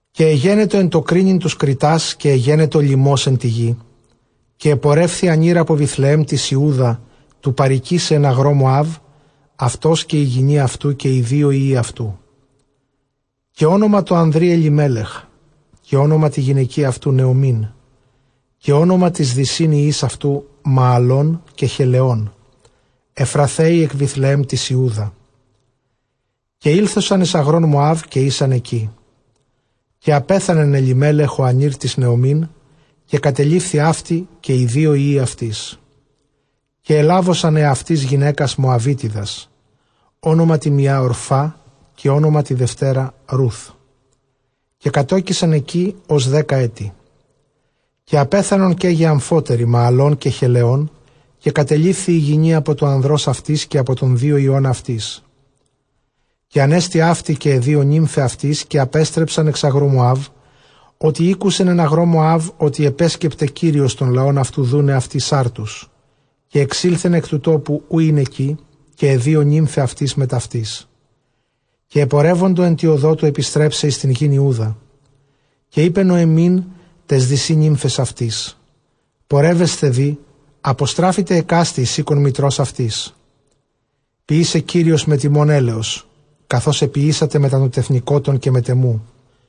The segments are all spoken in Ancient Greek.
ΚΑΙ ἐγένετο ἐν τῷ κρίνειν τοὺς κριτὰς, καὶ ἐγένετο λιμὸς ἐν τῇ γῇ· καὶ ἐπορεύθη ἀνὴρ ἀπὸ Βηθλεὲμ Ἰούδα τοῦ παροικῆσαι ἐν ἀγρῷ Μωὰβ, αὐτὸς καὶ ἡ γυνὴ αὐτοῦ, καὶ οἱ δύο υἱοὶ αὐτοῦ. Καὶ ὄνομα τῷ ἀνδρὶ Ἐλιμέλεχ, καὶ ὄνομα τῇ γυναικὶ αὐτοῦ Νωεμὶν, καὶ ὄνομα τοῖς δυσὶν υἱοῖς αὐτοῦ Μααλὼν, καὶ Χελαιὼν, Ἐφραθαῖοι ἐκ Βηθλεὲμ τῆς Ἰούδα· καὶ ἤλθοσαν εἰς ἀγρὸν Μωὰβ, καὶ ἦσαν ἐκεῖ. Καὶ ἀπέθανεν Ἐλιμέλεχ ὁ ἀνὴρ τῆς Νωεμὶν, καὶ κατελείφθη αὕτη καὶ οἱ δύο υἱοὶ αὐτῆς. Καὶ ἐλάβοσαν ἑαυτοῖς γυναῖκας Μωαβίτιδας· ὄνομα τῇ μιᾷ, Ὀρφά· καὶ ὄνομα τῇ δευτέρᾳ, Ῥούθ· καὶ κατῴκησαν ἐκεῖ ὡς δέκα ἔτη. Καὶ ἀπέθανον καί γε ἀμφότεροι Μααλὼν καὶ Χελαιών· καὶ κατελείφθη ἡ γυνὴ ἀπὸ τοῦ ἀνδρὸς αὐτῆς, καὶ ἀπὸ τῶν δύο υἱῶν αὐτῆς. Καὶ ἀνεστη αὕτη καὶ αἱ δύο νύμφαι αὐτῆς, καὶ ἀπέστρεψαν ἐξ ἀγροῦ Μωὰβ, ὅτι ἤκουσεν ἐν ἀγρῷ Μωὰβ ὅτι ἐπέσκεπται Κύριος τὸν λαὸν αὐτοῦ, δοῦναι αὐτοῖς ἄρτους. Καὶ ἐξῆλθεν ἐκ τοῦ τόπου οὗ ἦν ἐκεῖ, καὶ αἱ δύο νύμφαι αὐτῆς μετʼ αὐτῆς· καὶ ἐπορεύοντο ἐν τῇ ὁδῷ τοῦ ἐπιστρέψαι εἰς τὴν γῆν Ἰούδα. Καὶ εἶπε Νωεμὶν, ταῖς δυσὶ νύμφαις αὐτῆς, πορεύεσθε δὴ, ἀποστράφητε ἑκάστη εἰς οἶκον μητρὸς αὐτῆς· ποιήσαι Κύριος μεθʼ ὑμῶν ἔλεος, καθὼς ἐποιήσατε μετὰ τῶν τεθνηκότων καὶ μετʼ ἐμοῦ·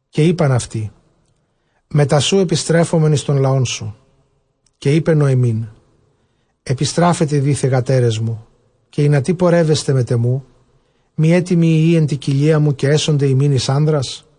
Καὶ εἶπαν αὐτῇ, μετὰ σου ἐπιστρέφομεν εἰς τὸν λαόν σου. Καὶ εἶπε Νωεμὶν, ἐπιστράφητε δὴ θυγατέρες μου· καὶ ἱνατί πορεύεσθε μετʼ ἐμοῦ; μὴ ἔτι μοι υἱοὶ ἐν τῇ κοιλίᾳ μου, καὶ ἔσονται ὑμῖν εἰς ἄνδρας;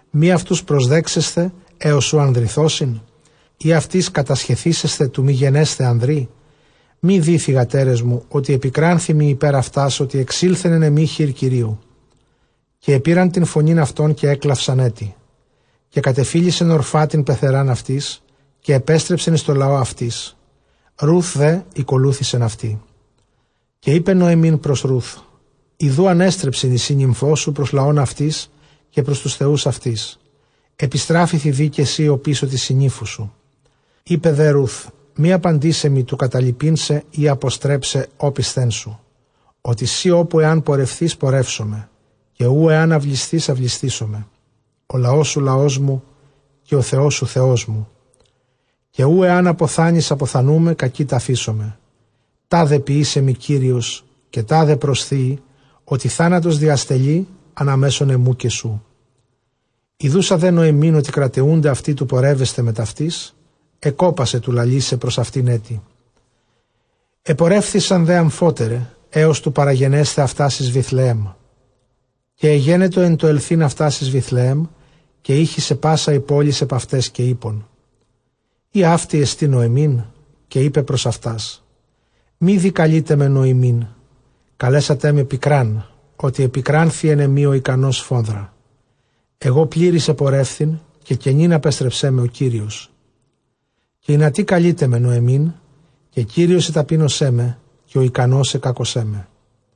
Μὴ αὐτοὺς προσδέξεσθε ἕως οὗ ἁδρυνθώσιν; ἢ αὐτοῖς κατασχεθήσεσθε τοῦ μὴ γενέσθαι ἀνδρί; μὴ δὴ θυγατέρες μου, ὅτι ἐπικράνθη μοι ὑπὲρ ὑμᾶς, ὅτι ἐξῆλθεν ἐν ἐμοὶ χεὶρ Κυρίου. Καὶ ἐπῇραν τὴν φωνὴν αὐτῶν, καὶ ἔκλαυσαν ἔτι· καὶ κατεφίλησεν Ὀρφὰ τὴν πενθερὰν αὐτῆς, καὶ ἐπέστρεψεν εἰς τὸν λαὸν αὐτῆς· Ῥοὺθ δὲ ἠκολούθησεν αὐτῇ. Καὶ εἶπε Νωεμῖν πρὸς Ῥοὺθ, ἰδοὺ ἀνέστρεψε σύννυμφός σου πρὸς λαὸν αὐτῆς καὶ πρὸς τοὺς θεοὺς αὐτῆς· ἐπιστράφηθι δὴ καὶ σὺ ὀπίσω τῆς συννύμφου σου. Εἶπε δὴ Ῥοῦθ, μὴ ἀπάντησαί μοι τοῦ καταλιπεῖν σε, ἢ ἀποστρέψαι ὄπισθέν σου, ὅτι σὺ ὅπου ἐὰν πορευθῇς, πορεύσομαι, καὶ οὗ ἐὰν αὐλισθῇς, αὐλισθήσομαι· ὁ λαός σου, λαός μου, καὶ ὁ Θεός σου, Θεός μου· Καὶ οὗ ἐὰν ἀποθάνῃς, ἀποθανοῦμαι, κᾀκεῖ ταφήσομαι· τάδε ποιήσαι μοι Κύριος, καὶ τάδε προσθείη, ὅτι θάνατος διαστελεῖ ἀναμέσον ἐμοῦ καὶ σοῦ. Ἰδοῦσα δὲ Νωεμὶν ὅτι κραταιοῦται αὐτὴ τοῦ πορεύεσθαι μετʼ αὐτῆς, ἐκόπασε τοῦ λαλῆσαι πρὸς αὐτὴν ἔτι. Ἐπορεύθησαν δὲ ἀμφότεραι, ἕως τοῦ παραγενέσθαι αὐτὰς εἰς Βηθλεέμ· καὶ ἐγένετο ἐν τῷ ἐλθεῖν αὐτὰς εἰς Βηθλεὲμ, καὶ ἤχησε πᾶσα ἡ πόλις ἐπʼ αὐταῖς, καὶ εἶπον, εἰ αὕτη ἐστὶ Νωεμίν; Καὶ εἶπε πρὸς αὐτὰς, μὴ δὴ καλεῖτέ με Νωεμίν· καλέσατέ με πικρὰν, ὅτι ἐπικράνθη ἐν ἐμοὶ ὁ ἱκανὸς σφόδρα. Ἐγὼ πλήρης ἐπορεύθην, καὶ κενὴν ἀπέστρεψέ με ὁ Κύριος· καὶ ἱνατί καλεῖτέ με Νωεμὶν, καὶ Κύριος ἐταπείνωσέ με, καὶ ὁ ἱκανὸς ἐκάκωσέ με;